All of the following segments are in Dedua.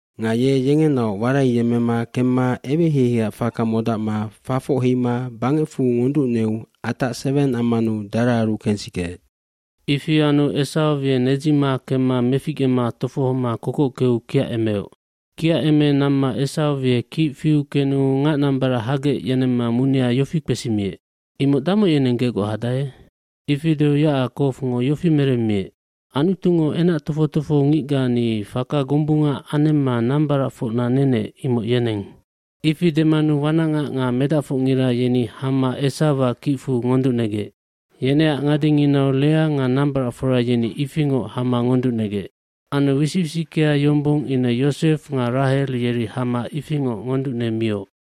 Nga ye yengenaoc waraiyemmema kemma eweheiheiac faka modacma fafoc heima bangecfu ngonducneu atac seweng ammanu daraaru kensikeec. Ifi anu Esaw ye nedzima kemma meficgema tofohoma kokockeu kiacemeoc. bKiaceme namma Esaw ye kic fiu kenu ngacnambarac hagec yenemma munia yofi kpesimiec, “Imoc damoc yeneng gegoc hadae?” Ifi deu Yacakowngo yofi meremmiec, “Anutungo enac tofoc tofohongicga ni faka gombunga anemma nambaracfocna nenec imoc yeneng.” Ifi demanu wanacngac nga medacfocngira yeni hama Esawac kicfu ngonducnegec. Yeneac ngadenginau Lea nga nambaracfora yeni ifingoc hama ngonducnegec. Anu wisic wisickea yombong ine Yosef nga Rahel yeri hama ifingoc ngonducnemioc.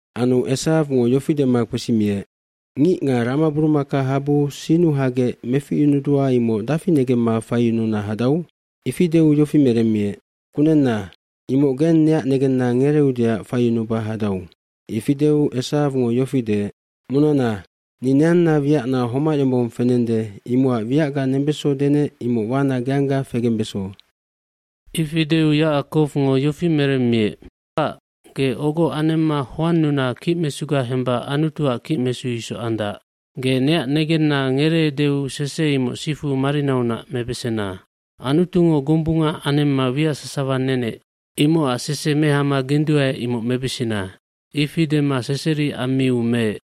Anu Esawngo yofi dema kpesimiec, “Ngic nga ramaburumakahabu sinnu hagec meficyunudua imoc dafi negemma faiyununa hadau?” Ifi deu yofi meremmiec, “Kunenna, imoc geng neac negenna ngereeudeac faiyunuba hadau.” Ifi deu Esawngo yofi deec, “Munana, ni neanna wiacna homac yombong fenende imocac wiacga nembeso denec imoc wana geangga fegembeso.” cIfi deu Yacakowngo yofi meremmiec, “Kpac, ge ogo anemma hoannuna kicmesuga hemba Anutuac kicmesu isoc andac. Ge neac negenna ngereeudeu sese imoc sifu marinaunac mebesena. Anutungo gombunga anemma wiac sasawa nenec.” Imocac sese mehama genduae imoc mebesena. Ifi dema seseri ammiu meec.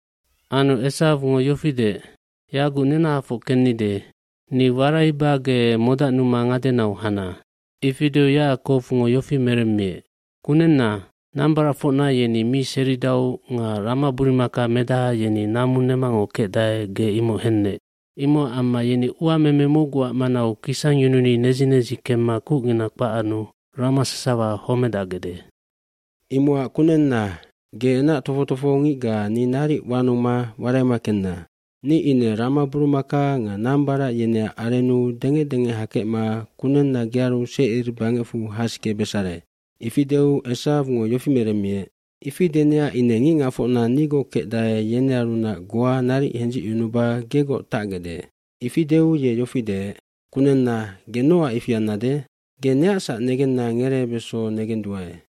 Anu Esawngo yofi deec, “Yaguc nenahafoc kennide. Ni waraiba ge modacnuma ngadenau hana.” Ifi deu Yacakowngo yofi meremmiec, “Kunenna, nambaracfocna yeni mi seridau nga ramaburumakamedaha yeni namu nemangoc kecdae ge imoc hennec. Imocac amma yeni uameme mocguac manau kisangyununi nedzi nedzi kemma kucngina kpac anu rama sasawa homedacgecde. Imocac kunenna, ge enac tofoc tofohongicga ni naric wanuma waraima kenna. Ni ine ramaburumaka nga nambarac yeneac arennu dengec dengec hakecma kunenna gearu Secir bangecfu hasikebesare.” Ifi deu Esawngo yofi meremmiec, “Ifi denecac ine ngicngacfocna nigoc kecdae yenearunac goa naric hendzicyunuba gegoc tacgecde.” Ifi deu ye yofi deec, “Kunenna, ge nocac ifi annade? Ge neacsac negenna ngereebeso negenduae.”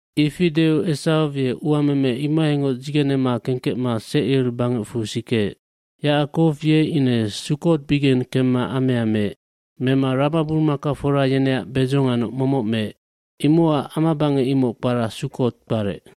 Ifi deu Esaw ye uameme imohaingoc dzigenema kengkecma Secir bangecfu sikeec. Yacakow ye ine Sukkotbigeng kemma amea meec. Mema ramaburumakafora yeneac bedzo nganoc momoc meec. Imocac amabangec imoc kpara Sukkotd kparec.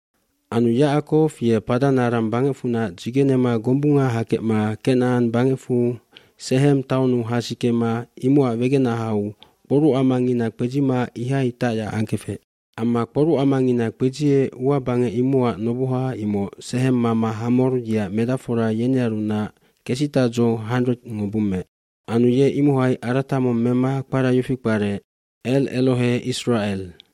Anu Yacakow ye Paddan Aram bangecfunac dzigenema gombunga hakecma Kenacan bangecfu Sehem taunnu hasikema imocac wegenahau kporucamangina kpedzima ihai tacyac angkefec. eAmma kporucamangina kpedziec ua bangec imocac noboha imoc Sehem mama Hamor yeac medacfora yenearunac kesitadzo 100ngo bummeec. Anu ye imohai arata mong mema kpara yofi kparec El Elohe Isracel.f